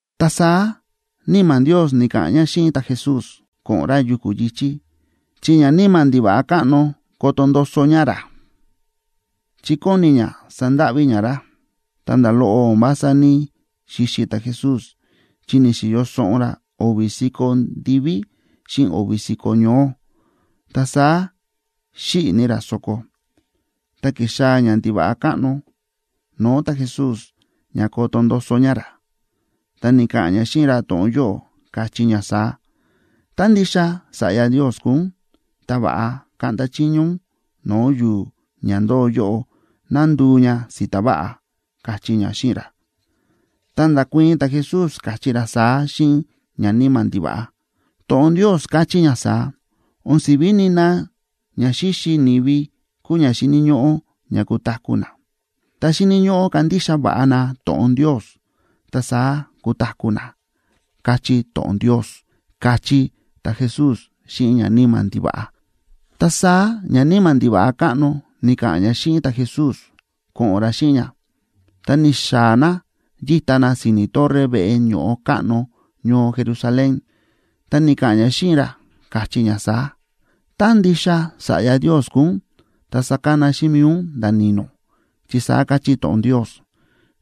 Ta saá Níma̱ Ndios ni̱ka̱ꞌa̱n ña xíꞌin ta̱Jesús ko̱ꞌo̱n ra yuku̱ yi̱chí, chi ñaníma̱ ndiva̱ꞌa káꞌno koto ndoso ña ra, chi kóni ña sandáꞌví ña ra. Ta nda̱ loꞌo o̱n vása ní‑xixi ta̱Jesús, chi ni̱xi̱yo soꞌon ra o̱vi̱ si̱ko̱ ndiví xíꞌin o̱vi̱ si̱ko̱ ñoó, ta saá xíꞌi̱ ní ra so̱ko. Ta ki̱xaa̱ ñandiva̱ꞌa káꞌno no̱o̱ ta̱Jesús ña koto ndoso ña ra, ta ni̱ka̱ꞌa̱n ña xíꞌin ra to̱ꞌon yóꞌo, káchí ña saá: ―Tá ndixa Sa̱ꞌya Ndios kúu ún, ta va̱ꞌa kaꞌnda chiño ún no̱o̱ yu̱u̱ ña ndóo yóꞌo ná nduu ña si̱ta̱ váꞌa ―káchí ña xíꞌin ra. Ta nda̱kuii̱n ta̱Jesús, káchí ra saá xíꞌin ñaníma̱ ndiva̱ꞌa: ―To̱ꞌon Ndios káchí ña saá: “O̱n si̱ví nina ña xíxi ni̱vi kúu ña xíni̱ ñóꞌó ña kutaku̱ na. Ta xíni̱ ñóꞌó kandixa va̱ꞌa na to̱ꞌon Ndios, ta saá kutaku̱ na”, káchí to̱ꞌon Ndios ―káchí ta̱Jesús xíꞌin ñaníma̱ ndiva̱ꞌa. Ta saá ñaníma̱ ndiva̱ꞌa káꞌno ni̱ka̱ꞌa̱n ña xíꞌin ta̱Jesús ko̱ꞌo̱n ra xíꞌin ña, ta ni̱xaa̱ na yíta na si̱ni̱ torre veꞌe ño̱ꞌo káꞌno ñoo Jerusalén, ta ni̱ka̱ꞌa̱n ña xíꞌin ra, káchí ña saá: ―Tá ndixa Sa̱ꞌya Ndios kúu ún, ta sakana xíꞌin mi̱i ún nda̱ ni̱no̱, chi saá káchí to̱ꞌon Ndios: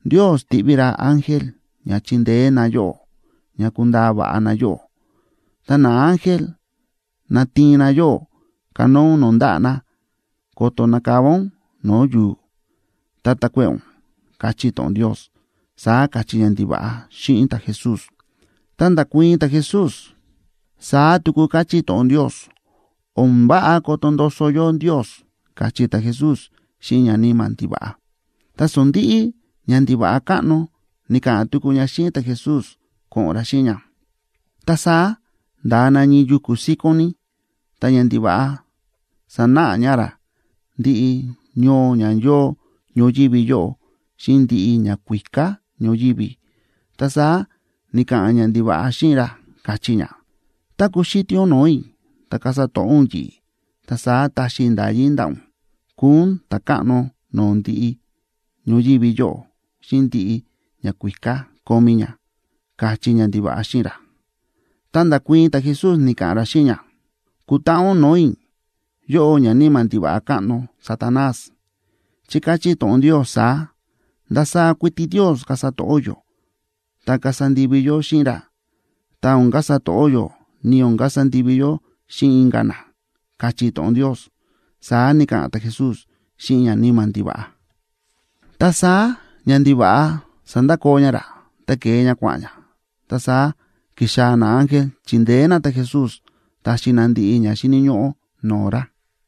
Ndios tiꞌví ra ángel ña chindeé na yóꞌó, ta kundaa va̱ꞌa na yóꞌó. Ta naángel natiin na yóꞌó kanóo ún no̱o̱ ndaꞌa̱ na, ko̱to̱ nakava ún no̱o̱ yu̱u̱, ta takuéꞌe̱ ún, káchí to̱ꞌon Ndios ―saá káchí ñandiva̱ꞌa xíꞌin ta̱Jesús. Ta nda̱kuii̱n ta̱Jesús: ―Saá tuku káchí to̱ꞌon Ndios: “O̱n váꞌa koto ndoso yó Ndios” ―káchí ta̱Jesús xíꞌin ñaníma̱ ndiva̱ꞌa. Ta sondi̱ꞌi ñandiva̱ꞌa káꞌno ni̱ka̱ꞌa̱n tuku ña xíꞌin ta̱Jesús ko̱ꞌo̱n ra xíꞌin ña, ta saá nda̱a na ñii yuku̱ síkón ní, ta ñandiva̱ꞌa sa̱náꞌa ña ra ndiꞌi ñoo ña yóo ñoyívi yóꞌo xíꞌin ndiꞌi ñakuíká ñoyívi. Ta saá ni̱ka̱ꞌa̱n ñandiva̱ꞌa xíꞌin ra, káchí ña: ―Tá kuxítí ún no̱o̱ i̱ ta kasa to̱ꞌó ún yi̱ꞌi̱, ta saá taxi i̱ nda̱yí ndaꞌa̱ ún kuu ún ta̱káꞌno no̱o̱ ndiꞌi ñoyívi yóꞌo xíꞌin ndiꞌi ñakuíká kómí ña ―káchí ñandiva̱ꞌa xíꞌin ra. Ta nda̱kuii̱n ta̱Jesús, ni̱ka̱ꞌa̱n ra xíꞌin ña: ―¡Kutaꞌa ún no̱o̱ i̱, yóꞌó, ñaníma̱ ndiva̱ꞌa káꞌno Satanás!, chi káchí to̱ꞌon Ndios saá: “Ndasaá kuiti Ndios kasa to̱ꞌó yó, ta kasa ndivi yó xíꞌin ra, ta o̱n kasa to̱ꞌó yó, ni o̱n kasa ndivi yó xíꞌin inka̱ na”, káchí to̱ꞌon Ndios ―saá ni̱ka̱ꞌa̱n ta̱Jesús xíꞌin ñaníma̱ ndiva̱ꞌa. Ta saá ñandiva̱ꞌa sa̱ndakoo ña ra, ta ke̱e ña kua̱ꞌa̱n ña, ta saá ki̱xaa̱ naángel chindeé na ta̱Jesús, ta̱xi na ndiꞌi ña xíni̱ ñóꞌó no̱o̱ ra.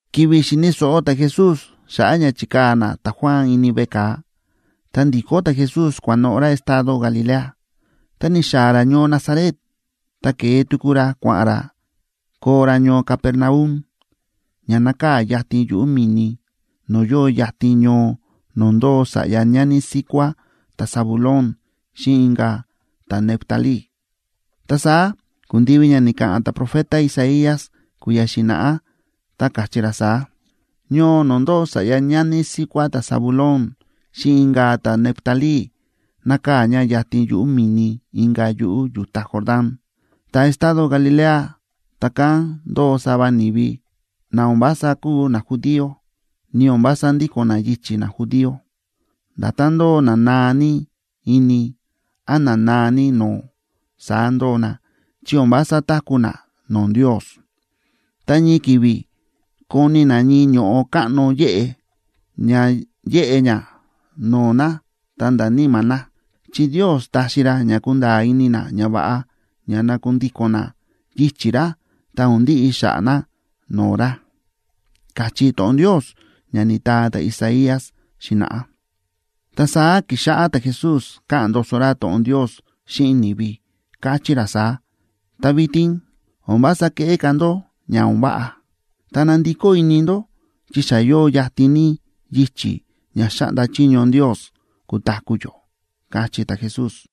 Ki̱vi̱ xi̱ni̱ so̱ꞌo ta̱Jesús xa̱ꞌa̱ ña chi̱kaa̱ na ta̱Juan ini veꞌe ka̱a, ta ndi̱kó ta̱Jesús kua̱noꞌo̱ ra estado Galilea. Ta ni̱xaa̱ ra ñoo Nazaret, ta ke̱e tuku ra kua̱ꞌa̱n ra koo ra ñoo Capernaum, ña nákaa̱ yatin yuꞌu̱ mi̱ni, no̱o̱ yóo yatin ñoo no̱o̱ ndóo sa̱ꞌya ñani síkuá ta̱Zabulón xíꞌin inka̱ ta̱Neftalí. Ta saá ku̱ndivi ña ni̱ka̱ꞌa̱n ta̱profeta Isaías kui̱ya̱ xi̱na̱ꞌá, ta káchí ra saá: Ñoo no̱o̱ ndóo sa̱ꞌya ñani síkuá ta̱Zabulón xíꞌin inka̱ ta̱Neftalí, nákaa̱ ña yatin yuꞌu̱ mi̱ni, inka̱ yuꞌu̱ yu̱ta Jordán. Ta estado Galilea, ta kán ndóo sava ni̱vi na o̱n vása kúu najudío, ni o̱n vása ndíko̱n na yichi̱ najudío. Nda̱tán ndóo na naa ní ini, án na naa ní no̱o̱, saá ndóo na, chi o̱n vása táku̱ na no̱o̱ Ndios. Ta ñii ki̱vi̱ koni na ñii ñoꞌo̱ káꞌno yéꞌe, ña yeꞌe ña no̱o̱ na ta̱nda̱ níma̱ na, chi Ndios taxi ra ña kunda̱a̱ ini na ñava̱ꞌa ña ná kundíko̱n na yichi̱ ra, ta o̱n ndiꞌi xa̱ꞌa̱ na no̱o̱ ra, káchí to̱ꞌon Ndios ña ni̱taa ta̱Isaías xi̱na̱ꞌá. Ta saá ki̱xáꞌá ta̱Jesús káꞌa̱n ndoso ra to̱ꞌon Ndios xíꞌin ni̱vi, káchí ra saá: ―Ta vitin o̱n vása keꞌé ka̱ ndó ña o̱n váꞌa, ta nandikó ini ndó, chi xa yóo yatin ní yichi̱ ña xáꞌnda chiño Ndios kutaku̱ yó ―káchí ta̱Jesús.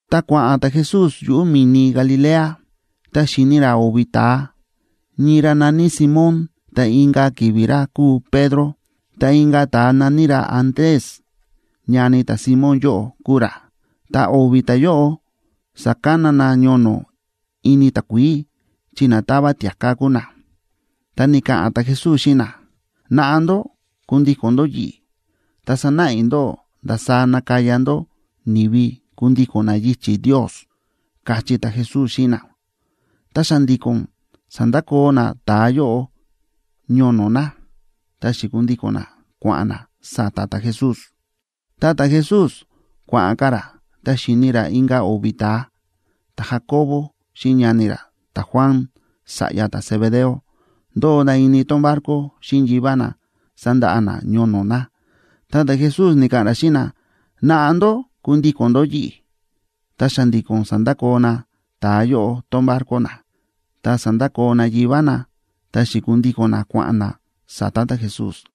Tá kua̱ꞌa̱n ta̱Jesús yuꞌu̱ mi̱ni Galilea, ta xi̱ni ra o̱vi̱ ta̱a, ñii ra na̱ní Simón ta inka̱ ki̱vi̱ ra kúu Pedro, ta inka̱ ta̱a na̱ní ra Andrés, ñani ta̱Simón yóꞌo kúu ra. Ta o̱vi̱ ta̱a yóꞌo sákana na ñono̱ ini takuií, chi na táva tia̱ká kúu na. Ta ni̱ka̱ꞌa̱n ta̱Jesús xíꞌin na: ―Naꞌa ndó kundíko̱n ndó yi̱ꞌi̱, ta sanáꞌa i̱ ndóꞌó ndasaá nakaya ndó ni̱vi kundíko̱n na yichi̱ Ndios ―káchí ta̱Jesús xíꞌin na. Ta xa̱ndi̱ko̱n sa̱ndakoo nata̱a yóꞌo ñono̱ na, ta xi̱kundíko̱n na kua̱ꞌa̱n na sa̱ta̱ ta̱Jesús. Ta ta̱Jesús kua̱ꞌa̱n ka̱ ra, ta xi̱ni ra inka̱ o̱vi̱ ta̱a, ta̱Jacobo xíꞌin ñani ra ta̱Juan, sa̱ꞌya ta̱Zebedeo. Ndóo na ini tón barco xíꞌin yivá na, sándaꞌa na ñono̱ na. Ta ta̱Jesús ni̱ka̱ꞌa̱n ra xíꞌin na: ―Naꞌa ndó kundíko̱n ndó yi̱ꞌi̱. Ta xa̱ndi̱ko̱n sa̱ndakoo nata̱a yóꞌo tón barco na, ta sa̱ndakoo na yivá na, ta xi̱kundíko̱n na kua̱ꞌa̱n na sa̱ta̱ ta̱Jesús.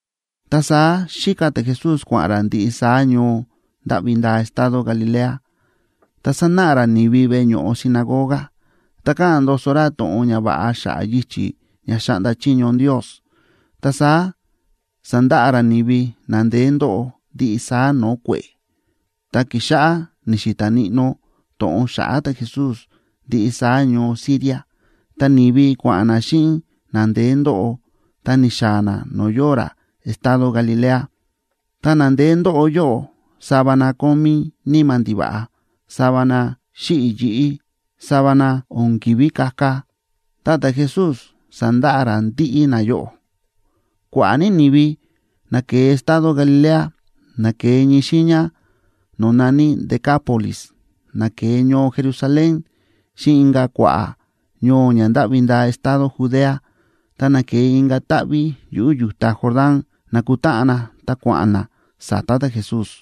Ta saá xíka ta̱Jesús kua̱ꞌa̱n ra ndiꞌi saá ñoo ndáꞌvi ndaa estado Galilea, ta sánáꞌa ra ni̱vi veꞌe ño̱ꞌo sinagoga, ta káꞌa̱n ndoso ra to̱ꞌon ñava̱ꞌa xa̱ꞌa̱ yichi̱ ña xáꞌnda chiño Ndios, ta saá sándaꞌa ra ni̱vi na ndeé ndóꞌo ndiꞌi saá no̱o̱ kue̱ꞌe̱. Ta ki̱xáꞌá ni̱xi̱ta̱ níꞌnó to̱ꞌon xa̱ꞌa̱ ta̱Jesús ndiꞌi saá ñoo Siria, ta ni̱vi kua̱ꞌa̱n na xíꞌin na ndeé ndóꞌo ta ni̱xaa̱ na no̱o̱ yóo ra estado Galilea. Ta na ndeé ndóꞌo yóꞌo, sava na kómí níma̱ ndiva̱ꞌa, sava na xíꞌi̱ yi̱ꞌí, sava na o̱n ki̱ví kaka, ta ta̱Jesús sa̱ndaꞌa ra ndiꞌi nayóꞌo. Kua̱ꞌa̱ ní ni̱vi na ke̱e estado Galilea, na ke̱e ñii xiiña no̱o̱ na̱ní Decápolis, na ke̱e ñoo Jerusalén, xíꞌin inka̱ kua̱ꞌa̱ ñoo ña ndáꞌvi ndaa estado Judea, ta na ke̱e inka̱ táꞌví yuꞌu̱ yu̱ta Jordán, na̱kutáꞌan na ta kua̱ꞌa̱n na sa̱ta̱ ta̱Jesús.